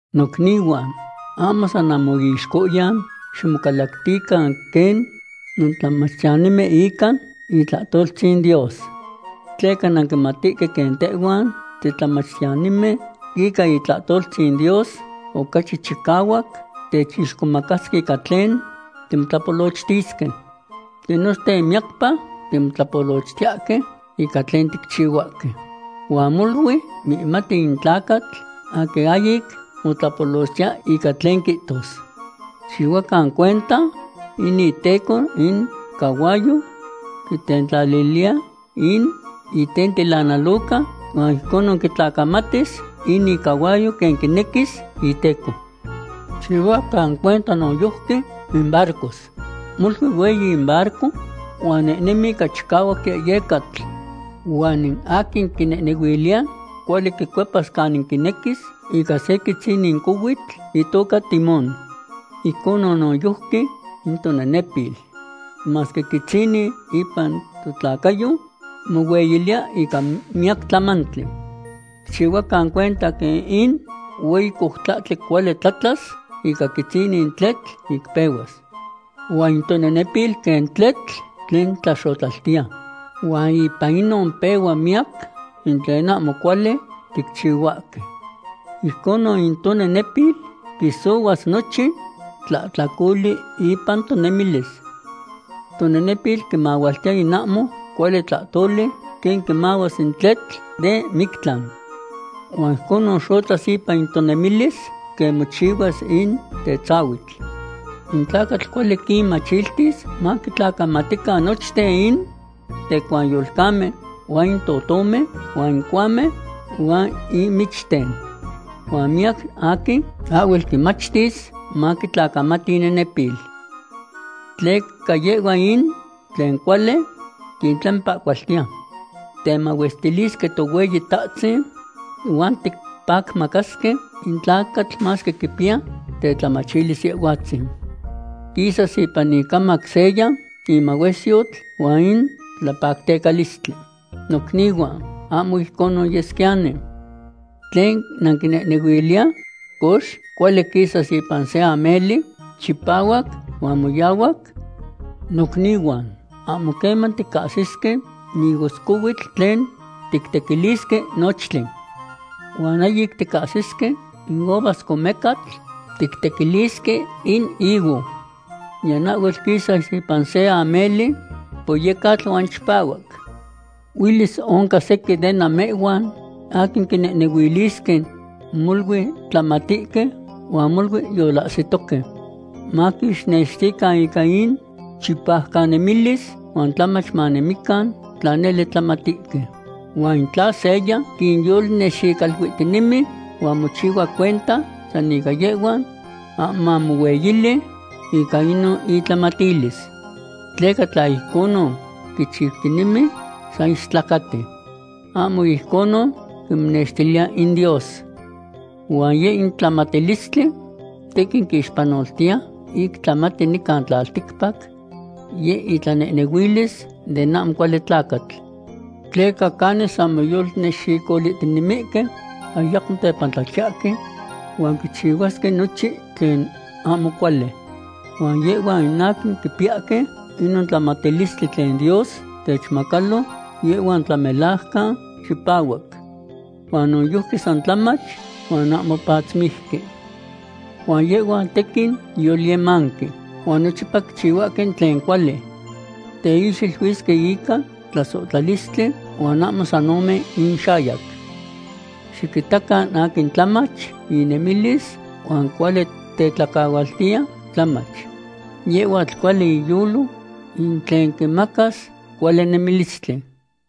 Nocnihuan, ahmo san namoixcohyan ximocahcalactican quen nantlamachtiyanimen ica itlahtoltzin Dios. Tleca nanquimatihque quen tehhuan titlamachtiyanimen ica itlahtoltzin Dios ocachi chicahuac techixcomacasque ica tlen timotlapolochtisque. Tinochten miyacpa timotlapolochtiyahque ica tlen ticchihuahque. Huan molui mihmati in tlacatl aquin ahyic motlapolochtiya ica tlen quihtos. Xicchihuacan cuenta; in iteco in cahuayo quitentlaliliya in itentilanaloca, huan ijconon quitlacamatis in cahuayo quen quinequis iteco. Xicchihuacan cuenta noyojqui in barcos. Molui hueyi in barco huan nehnemi ica chicahuac yehyecatl. Huan in aquin quinehnemiltiya cuali quicuepas canin quinequis ica se quitzinin cohuitl itoca timón. Ijconon noyojqui in tonenepil. Masque quitzinin ipan totlacayo, mohueyiliya ica miyac tlamantli. Xicchihuacan cuenta quen in hueyi coutlahtli cuali tlatlas ica quitzinin tletl ic pehuas. Huan in tonenepil quen tletl tlen tlaxotlaltiya. Huan ipan inon pehua miyac in tlen ahmo cuali ticchihuahque. Ijconon in tonenepil quisohuas nochin tlahtlacoli ipan tonemilis. Tonenepil quimahualtiya in ahmo cuali tlahtoli quen quimahuas in tletl den mictlan. Huan ijconon xotlas ipan tonemilis quen mochihuas in tetzahuitl. In tlacatl cuali quinmachtis maquitlacamatican nochten in tecuanyolcamen, huan in totomen, huan in cuamen, huan in michten. Huan niyan aquin ahhuel quimachtis maquitlacamati inenepil. Tleca yehhua in tlen cuali quintlamipahcualtiya. Titemahuestilisque Tohueyitahtzin, huan ticpactecasque in tlacatl masque quipiya tetlamachilis Yehhuatzin. Quisas ipan icamac seya in mahuesyotl huan in tlapactecalistli. Nocnihuan, ahmo ijconon yesquiyani. ¿Tlen nanquinehnehuiliya? Cox, ¿cuali quisas ipan se ameli chipahuac huan moyahuac? Nocnihuan, ahmo queman ticahsisque in higoscohuitl tlen tictequilisque nochtli. Huan ahyic ticahsisque in ovascomecatl tictequilisque in higo. Niyan ahhuel quisas ipan se ameli poyec atl huan chipahuac. Huelis oncan sequin de namehhuan aquin quinehnehuilisque molui tlamatihque huan molui yolahsitoque. Maquinextican ica in chipaucanemilis huan tlamach manemican tla nele tlamatihque. Huan in tla seya quinyolnexicolihtinemi huan mochihua cuenta san ica yehhua, ahmo mamohueyili ica inon itlamatilis. Tleca tla ijconon quichiutinemi, san istlacati. Ahmo ijconon quimonextiliya in Dios. Huan yeh in tlamatilistli tequin quixpanoltiya ic tlamati nican tlalticpac. Yeh itlanehnehuilis den ahmo cuali tlacatl. Tleca canin san moyolnexicolihtinemihque, ayacmo tepantlachiyahque, huan quichihuasque nochin tlen ahmo cuali. Huan yehhuan in aquin quipiyahque inon tlamatilistli tlen Dios techmacalo, yehhuan tlamelajcan chipahuac. Huan noyojqui san tlamach huan ahmo patzmijqui. Huan yehhuan tequin yolyemanqui, huan nochipa quichihuahque in tlen cuali. Teixiluisque ica tlasohtlalistli huan ahmo san ome inxayac. Xiquitacan aquin tlamach inemilis huan cuali tetlacahualtiya tlamach. Yehhuatl cuali iyolo, in tlen quimacas cuali nemilistli.